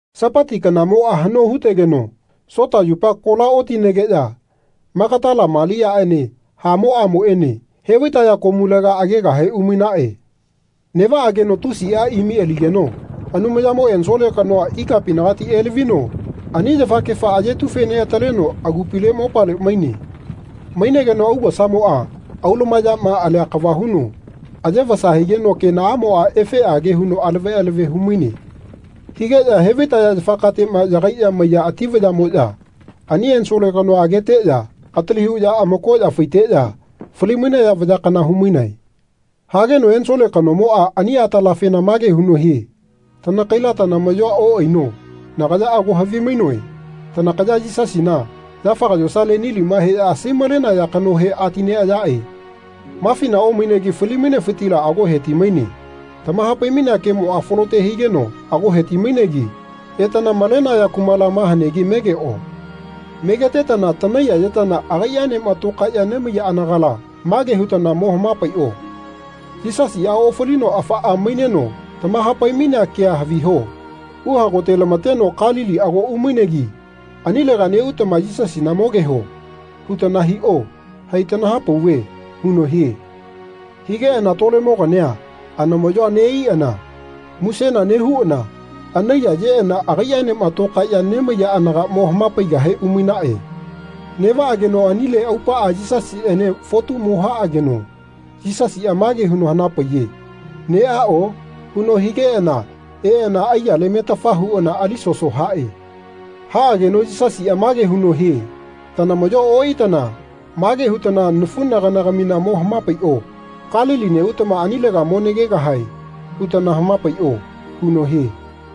Sapati kanamoꞌa haꞌno hu-tegeno Sota yupa kola otinegeꞌya Magatala Maliaꞌene hamoꞌamoꞌene he-vai-taya komulega agegahe umainaꞌe. Neꞌvaꞌageno tusiꞌa imi aligeno Anumayamo ensole kanoa ikapinagati elavino ani yafakefa ayetu-fe-neꞌataleno agupile mopale maine. Mainegeno augosamoꞌa aulumayaꞌma alia kava huno aye-vasa higeno kenaꞌamoꞌa efeꞌage huno alave alave hu-maine. Higeꞌya he-vai-taya yafakateꞌma yagaiꞌya maiya ati vayaꞌmoꞌya ani ensole kanoa ageteꞌya atili huꞌya amakoꞌya faiteꞌya fali-mainaya vaya kana hu-mainae. Hageno ensole kanomoꞌa ani atalafena mage huno hie “Tanakaila tanamaꞌyoa oꞌaino. Nagaya ago havimainoe tanakaya Yisasina, yafaga yosale nilima heꞌya asai-malenaya kanohe ati-neꞌayaꞌe. Mafina omainegi fali-mainefitila ago heti-maine. Tamaha-pai-mainea kemoꞌa falote higeno ago he-ti-mainegi etana malenaya kumala ma hanegi megeꞌo. Megetetana tanaiyayetana agaiꞌaenema tokaeꞌya nemaiya anagala mage hutana mo hama-paiꞌo ‘Yisasiꞌa ofalino afaꞌama maineno tamaha-pai-mainea kea haviho. Uhagotela-mateno Kalili ago umainegi anilega neꞌutama Yisasina mogeho.’ hutana hiꞌo. Hai tanaha-pauve.” huno hie. Higeꞌana tolemogania anamaꞌyoa neꞌaiꞌana musena nehuꞌana anaiyayeꞌana agaiꞌaenema tokaeꞌya nemaiya anaga mo hama-paigahe umainaꞌe. Neꞌvaꞌageno anile aupaꞌa Yisasiꞌene fotu mo haꞌageno Yisasiꞌa mage huno hanapaiye “Neꞌaꞌo?” huno higeꞌana eꞌana aiyale metafa huꞌana ali soso haꞌe. Haꞌageno Yisasiꞌa mage huno hie “Tanamaꞌyoa oꞌaitana mage hutana nafuꞌnaganagamina mo hama-paiꞌo ‘Kalili neꞌutama anilega mo nagegahae.’ hutana hama-paiꞌo.” huno hie.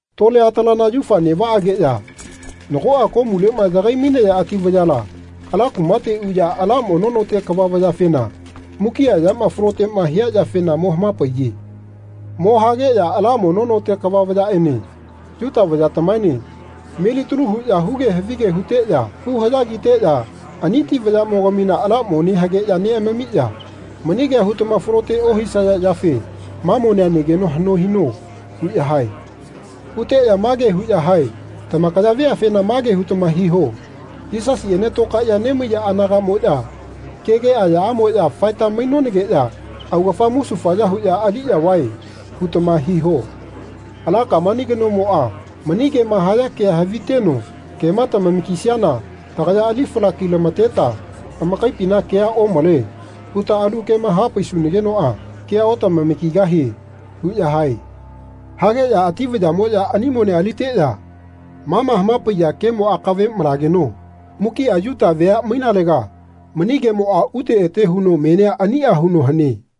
Tole atalana yaufa neꞌvaꞌageꞌya nagoꞌa komuleꞌma yagai-maiya ati vayala ala kumate uꞌya ala mono note kava vayafena mukiꞌa yama faloteꞌma hia yafena mo hama-paiye. Mo hageꞌya ala mono note kava vayaꞌene Yuta vayatamaene melitalu huꞌya huge havige huteꞌya hu-haꞌya kiteꞌya ani ati vayaꞌmogamina ala mone hageꞌya neꞌamamiꞌya “Mani kea hutama falote ohisaya yafe ma monea negeno haꞌno hino.” huꞌya hae. Huteꞌya mage huꞌya hae “Tamakaya veafena mage hutama hiho ‘Yisasiꞌene tokaeꞌya nemaiya anagaꞌmoꞌya kege ayaꞌamoꞌya faeta mainonageꞌya augafa musufaya huꞌya aliꞌya vae.’ hutama hiho. Ala kamani kanomoꞌa mani kema haya kea haviteno kema tamama-kisiana tagaya ali fala-ki-lama-teta ‘Amakaipina kea omale.’ huta alu kema hapaisunanagenoꞌa kea-otamama-kigahie.” huꞌya hae. Hageꞌya ati vayaꞌmoꞌya ani monea aliteꞌya ma ma hama-paiya kemo akave malageno mukiꞌa Yuta vea mainalega mani kemoꞌa ute ete huno menia aniꞌa huno hane.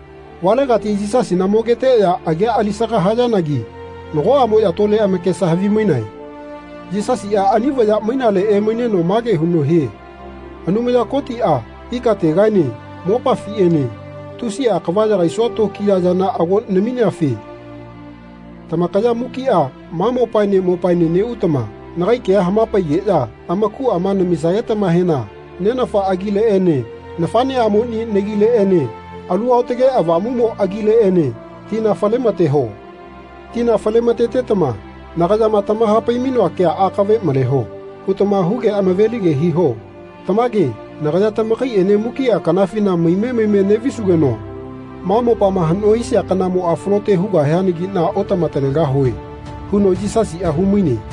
Valegati Yisasina mogeteꞌya agia alisaga hayanagi nagoꞌamoꞌya tole amakesa havimainae. Yisasiꞌa ani vaya mainale emaineno mage huno hie “Anumaya Kotiꞌa ikategaene mopafiꞌene tusiꞌa kava yagaisua tokiya yana ago namiafe tamakaya mukiꞌa ma mopaene mopaene neꞌutama nagai kea hama-paigeꞌya amakuꞌa namisagetamahena Nenafa agileꞌene nafaꞌneꞌamoni nagileꞌene Alu Aotage Avamumo agileꞌene tina fale-ma-teho. Tina fale-ma-tetama nagayama tamaha-pai-mainoa kea ‘Akave maleho.’ hutama huge hama-velige hiho. Tamage nagaya tamakaiꞌene mukiꞌa kanafina maime maime neꞌvisugeno ma mopama haꞌno hisia kanamoꞌa falote hugahianagiꞌna otama-talegahue.” huno Yisasiꞌa hu-maine.